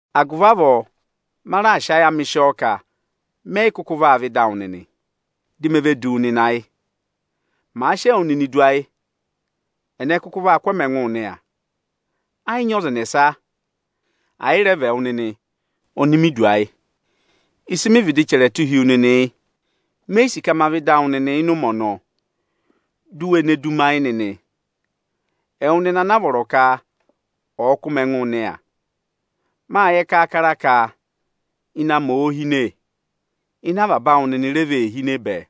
Agụvị avọọ ma raà sị ayị amị sị ọọ ka mẹ yị kụkụ vaa vẹ ịda awụ nịnị, di me ve du wu nịnị ayị. Mâ sị ẹwụ nịnị du ayị, ẹnẹ kụkụ vaa kụ́ ẹmị ẹngụụ nịya? Ẹ yị nyị ọza ẹnẹsa, ẹ̀ yị rẹ vị ẹwụ nịnị oni mi du ayị. Ịsị mị vịdị rẹ chẹrẹ tụ́ hi wu nịnị yị. Me yi sì ka ma vẹ ịda awụ nịnị ịnị ụmẹ ọnọọ, di u we ne du mi ayị nịnị, ẹwụ nịnị anaa vọrọ ka ọ̀ kụ́ mị ẹngụ nịya. Mâ yẹ kaakara ka ịnẹ amị òo hine, ịnẹ avaba awụ nịnị re vee hine bẹẹ.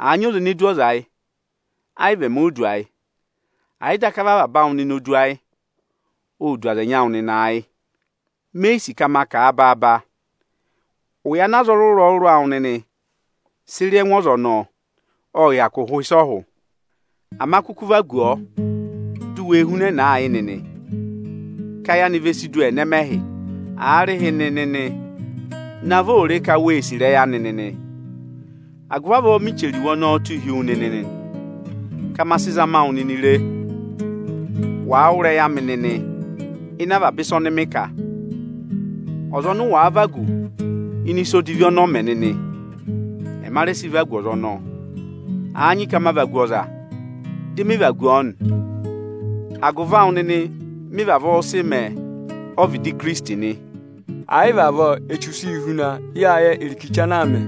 Àa nyị ọza ene du ọza ayị, ayị vị emi o du ayị. Ẹ̀ yị daka vị avaba awụ nịnị o du ayị, ô du aza ẹnyị awụ nịnị ayị. Me yi sì ka ma kà a baaba. Ụya ana aza ọrụrụ-ọrụrụ awụ nịnị sị rị ẹngụ ọza ọnọọ, ộ hyakụ hụ ịsị ọ hụ. Ama kụkụ vagu ọọ du wee hunẹnẹẹ ayị nịnị, ka ayị anị ve si du ẹnẹmẹhị! Aarịhịnị nịnị, navọ ò re ka we yi sì ịrẹyị anị nịnị! Agụvị avọọ mị chẹrẹ iwe ọnọọ tụ́ hi wu nịnị nị, ka ma sị zama wụ nịnị re, wàa wụ́ ịrẹyị amị nịnị ịnị avaba ịsa ọnị mị kà. Ọza ọnị ụ wàa vagu ịnị ịsa odivi ọnị ọ mẹ nịnị, ẹma rẹ sị vagu ọza ọnọọ. Àa nyị ka ma vagu ọza, dị mị vagu ọọ nị, agụvị awụ nịnị mị vavọọ sị mẹ ọ́vịdị Ikirisiti nị. Ẹ̀ yị vị avọọ, Echu sị yị huna. Yáa yẹ irikichi ana aa mẹ.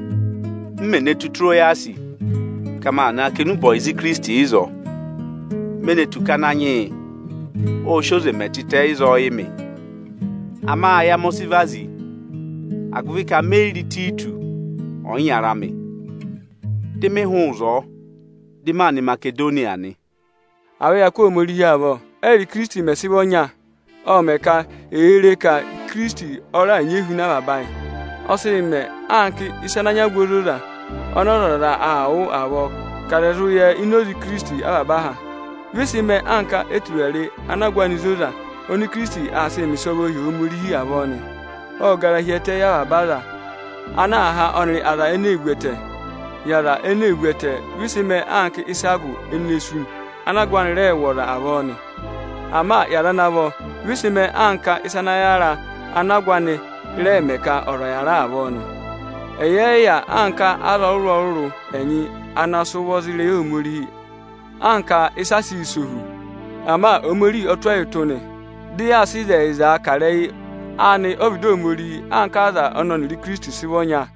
M mè ne tù Itirowasị ka ma na kà enube ọyịza Ikirisiti ịzọọ, me ne tù ka Ananyị yị ọ sị oze mẹ tịtẹ ịzọọ yị mị. Ama ayị amị ọ sị vazi, agụvị ka me yi re Ịtayịtọsị ọyịnyara amị. Dị mị hụụ ịzọọ, dị maa nọ Imasedoniya nị. À vẹ ya kụ́ Ohomorihi avọ! Ẹ́yịrị Ikirisiti mẹ̀ sị vị ọnya, ộ mẹ̀ ka è ree ka Ikirisiti ọ raà nyị ehuna avaba ayị. Ộ sị yị mẹ anka ịsa ana nyị agụ ozoza ọnị ọzọza aa wụ́ avọọ ka aza ẹ̀ zụ yẹ ini oze Ikirisiti avaba aha. Vị ị sị mẹẹ anka eturare ana agụ anị zoza oni Ikirisiti aa sịị mẹ ịsọvọọ hi Ohomorihi avọọ nị. Ộ gara hi ẹtẹ yị avaba aza ana aa há ọnịrị aza ene ee vu ẹtẹ. Yị aza ene ee vu ẹtẹ, vị ị sị mẹẹ anka ịsa agụ ene sú, ana agụ anị rẹẹ̄ wụ̀ ọza avọọ nị. Ama yị aza ana vọ, vị ịsị mẹẹ anka ịsa ana yàra, ana agụ anị rẹẹ̄ mẹ ka ọza ọ̀ yàra avọọ nị. Ẹyị ẹ yị yà anka aza ọrụrụ-ọrụrụ ẹnyị ana sị ụvọ za ịrẹyị Ohomorihi anka ịsị a sịị̄ sẹ ohu. Ama Ohomorihi ọ tụ́ ẹyị ụtụ nị, dị yaa sị ịzẹyịzaa kà ịrẹyị anị ọ́vịdị Ohomorihi anka aza ọnị ọnịrị Ikirisiti sị vị ọnya.